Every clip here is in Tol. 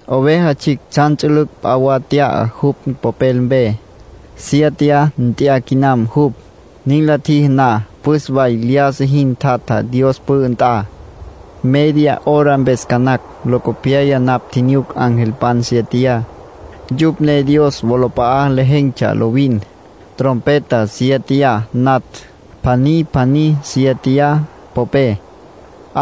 Oveja Tsjicj tsjan ts'ülüc' p'a wa nt'ya jupj popel mpe. Siéteya nt'ya quinam jupj. Nin la tjiji na, püs way lyájasa jin tjatja Dios pü'ü nt'a, media hora mpes ca nacj. Locopyaya napj tjinyuc angelpan siéteya. Yupj ne Dios wolap'a'a lejen̈tsja lovin. Trompeta siéteya natj, pjaní pjaní siéteya popé.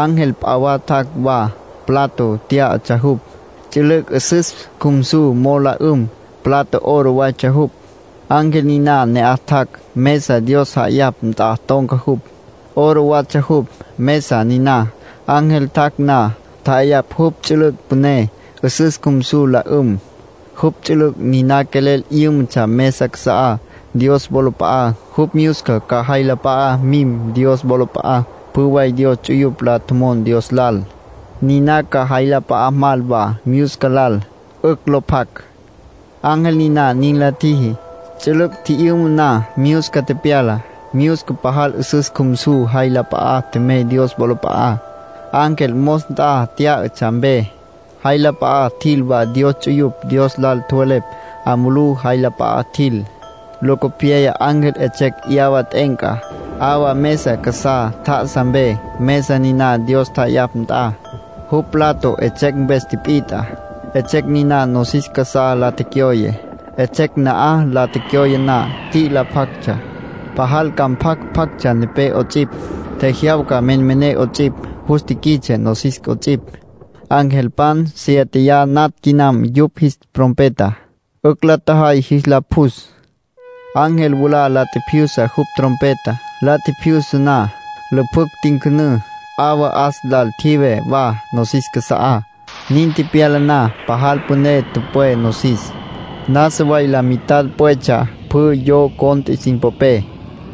Ángel p'a wa tjac' wa. Plato tyá'atsja jupj, ts'ülüc' 'üsüs cjumsu mo'o la 'üm. Plato oro waytsja jupj. Ángel niná ne'aj tjac', mesa Dios ja'ayapj nt'a ton̈ca jupj. Oro watsja jupj, mesa niná. Ángel tjac' na, tja'ayapj jupj ts'ülüc' püné, 'üsüs cjumsu la 'üm. Jupj ts'ülüc' niná quelel 'yǘmatsja mesa casa'á Dios wolap'a'á, jupj myusca ca jay la p'a'a mim Dios wolap'a'á. Pjü way Dios ts'uyupj la tjomon Dios lal, niná ca jay la p'a'a mal wa myusca lal, 'ücj lo pjac. Ángel niná nin la tjiji. Ts'ülüc' tji'yüma na, myusca tepyala. Myusca pajal 'üsüs cjumsu jay la p'a'a tjemey Dios wolap'a'á, ángel mos nt'a tyá'atsja mpe. Jay la p'a'a tjil wa Dios ts'uyupj Dios lal tjowelepj. 'A mulú jay la p'a'a tjil. Locopyaya ángel 'etsjecj 'yawa t'e'enca, 'awa mesa casá tjá'asa mpe, mesa niná Dios ja'ayapj nt'a. Jupj plato 'etsjecj mpes tipit'a. 'Etsjecj niná nosis casá la tecyoye. 'Etsjecj na'aj la tecyoye na, t'i'ila pjactsja, pajal ca mpjac pjactsja nepé 'ots'ipj, tjejyawca menmené 'ots'ipj, jus tiquits'e nosis 'ots'ipj. Angelpan siéteya natj quinam yupj jis trompeta. 'Ücj la tjajay jis la pjus. Ángel mwalá la tjipjyusa jupj trompeta. La tjipjyusa na, lüpjücj tincünǘ. 'Awa 'as lal tjive wa nosis casa'á. Nin tepyala na, pajal püné tüpwé nosis, nasa way la mitad pwetsja. Pjü yo cont'e sin popé,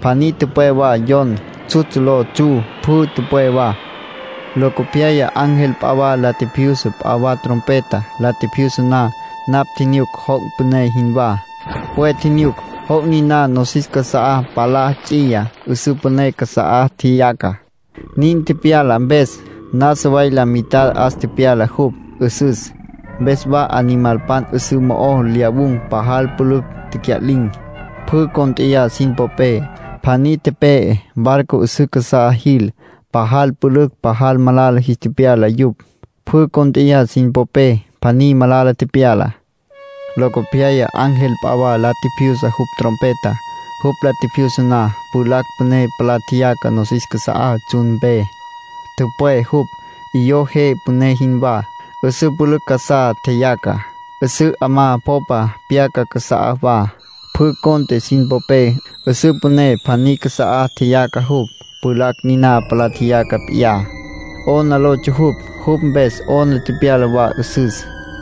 pjaní tüpwé wa yon. Tsjutsj lo tsju pjü tüpwé wa. Locopyaya ángel p'a wa la tjipjyusa p'a wa trompeta. La tjipjyusa na, napj tjinyuc joc' püné jinwá. Pwe tjinyuc. Joc' niná nosis casa'á palá ts'iya, 'üsǘ püné casa'á tjeyaca. Nin tepyala mpes, nasa way la mitad 'as tepyala jupj, 'üsüs. Mpes wa animalpan 'üsǘ mo'o lyawun̈ pajal pülücj tecya'lin̈. Pjü cónt'eya sin popé, pjaní tepe'e. Barco 'üsǘ casá jil, pajal pülücj pajal malala jis tepyala yupj. Pjü cónt'eya sin popé, pjaní malala tepyala. Locopyaya ángel p'a wa la tjipjyusa jupj trompeta. Jupj la tjipjyusa na, pjulacj püné palá tjeyaca nosis casa'á tsjun mpe. Tüpwé jupj, 'iyó je püné jinwá. 'Üsǘ pülücj casá tjeyaca, 'üsǘ 'amá popa pyaca casa'á wa. Pjü cont'e sin popé, 'üsǘ püné pjaní casa'á tjeyaca jupj. Pjulacj niná palá tjeyaca p'iyá, “'Ona” lotsja jupj. Jupj mpes 'ona tepyala wa 'üsüs.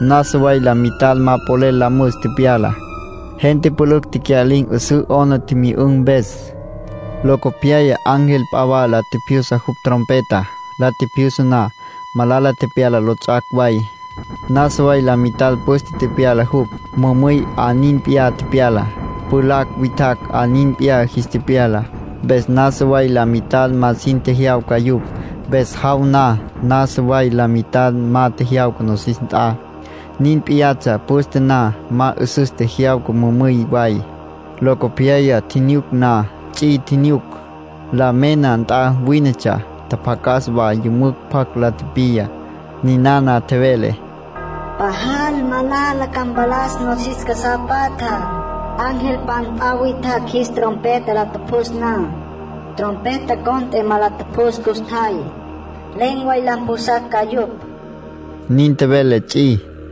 Nasa way la mitad ma polel la müs tepyala. Gente pülücj tecya'lin̈ 'üsǘ 'ona tjimyü'ün̈ mpes. Locopyaya ángel p'a wa la tjipjyusa jupj trompeta. La tjipjyusa na, malala tepyala lots'ac' way. Nasa way la mitad püste tepyala jupj. Mümüy 'a nin p'iyá tepyala, pjulacj witjacj 'a nin p'iyá jis tepyala. Mpes nasa way la mitad ma sin tjejyawca yupj. Mpes jaw na, nasa way la mitad ma tjejyawca nosis nt'a. Nin p'iyatsja püste na. Ma 'üsüs tjejyawca mümüy way. Locopyaya tjinyuc na, ts'i tjinyuc. La mena nt'a wínetsja. Tjapjacas wa yümücj pjac la tipiya. Ninana tjevele: “Pajal malala ca mpalas nosis casá patjá, angelpan p'a witjacj jis trompeta la tjupjus na. Trompeta cont'e ma la tjupjus custjay. Len̈ way la mpjusacj ca yupj”, nin tjevele ts'i.